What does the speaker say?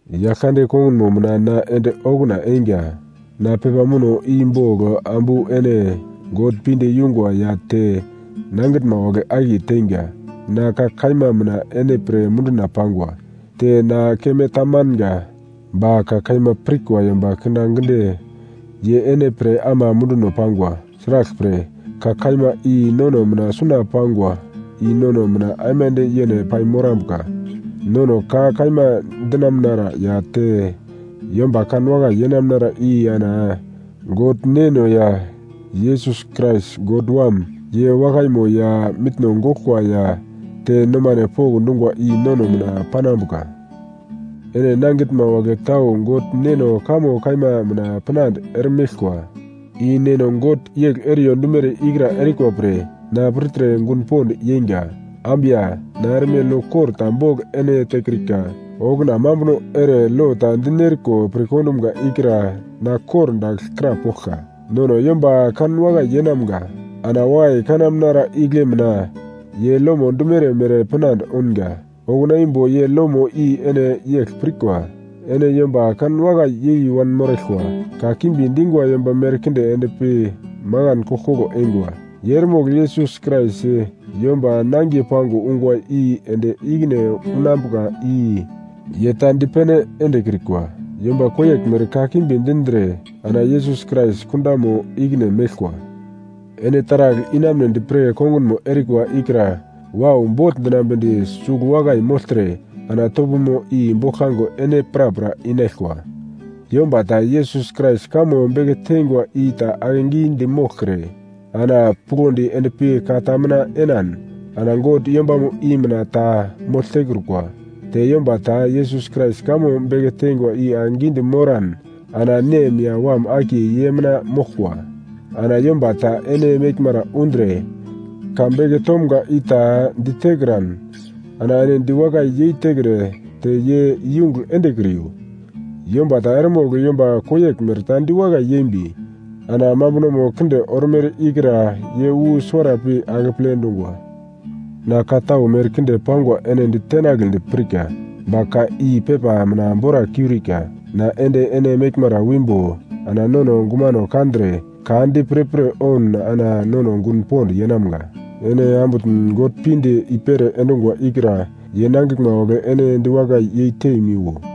Yaglkande kongunmo mina na ende okuna einga, na pepa muno i bogl ambu ene God pinde yungwa ya te nangitnma wagle akiye teinga. Na ka kaima mina ene pre munduna pangwa. Te na keme tamanga, ba ka kaima pirkwa yomba kindaginde ye ene pre ama munduno pangwa. Sraglpre, ka kaima i nono mina suna pangwa i nono mina aimande yene paimorambuka. Nono ka kaima dinamunara ya te yomba kanwakai yenamnara i ana God Neno ya Yesus Krais God Wam, ye wakaimo ya mitno goglkwa ya te nomane pokndungwa i nono mina panambuka. Ene nangitnma wagle tau God Neno kamo kaima mina pinande eremeglkwa, i Neno God yegl eriyo dumere ikra erikwa pre na pirtre gun pond yeinga. Ambu ya, na erme lo kor ta bogl ene tekrika, okuna mambuno ere lo ta dinerko pirkondumga ikra na kordagl krapoglka: Nono yomba kanwakai yeinamga. Ana wakai kanamnara igle mina ye lomo dumere mere pinande ounga. Okuna imbo ye lomo i ene yegl pirkwa: Ene yomba kanwakai yei wanmoraglkwa. Ka kimbi dingwa yomba merkinde endpi makan koglkoglo eingwa. Ye eremogl Yesus Krais, yomba nangiye pango ungwa i ende ikine unambuka i ye ta dipene endekrikwa. Yomba koyeglmere kakimbi dindre ana Yesus Krais kundamo ikine meglkwa. Ene taragl inamunedi pre kongunmo erikwa ikra wau bogl dinambedi sugl wakai mogltre ana topomo i boglkango ene prapra inaglkwa. Yomba ta Yesus Krais kamo beke teingwa i ta akegidi moglkre ana puglondi endpi ka ta mina enan ana God yombamo i mina ta mogl tekrukwa. Te yomba ta Yesus Krais kamo beke tengwa i akegidi moran ana Nem ya Wam akiye ye mina moglkwa. Ana yomba ta ene meglmara undre ka beke tomga i ta ditekran ana ene diwakai yeitekre te ye iyungugl endekriyo. Yomba ta eremogl yomba koyeglmere ta diwakai yembi ana mambunomo kinde ormere ikra ye wu suwara pi akeple dungwa. Na ka tau merkinde pangwa ene ditenagledi pirka, ba ka i pepa mina bora kiurika. Na ende ene meglmara wimbo ana nono gumano kandre ka di pirpir oun ana nono gun pond yeinamga. Ene ambutn God pinde i-pere endungwa ikra ye nangiglma wagle ene diwakai yeitemiwo.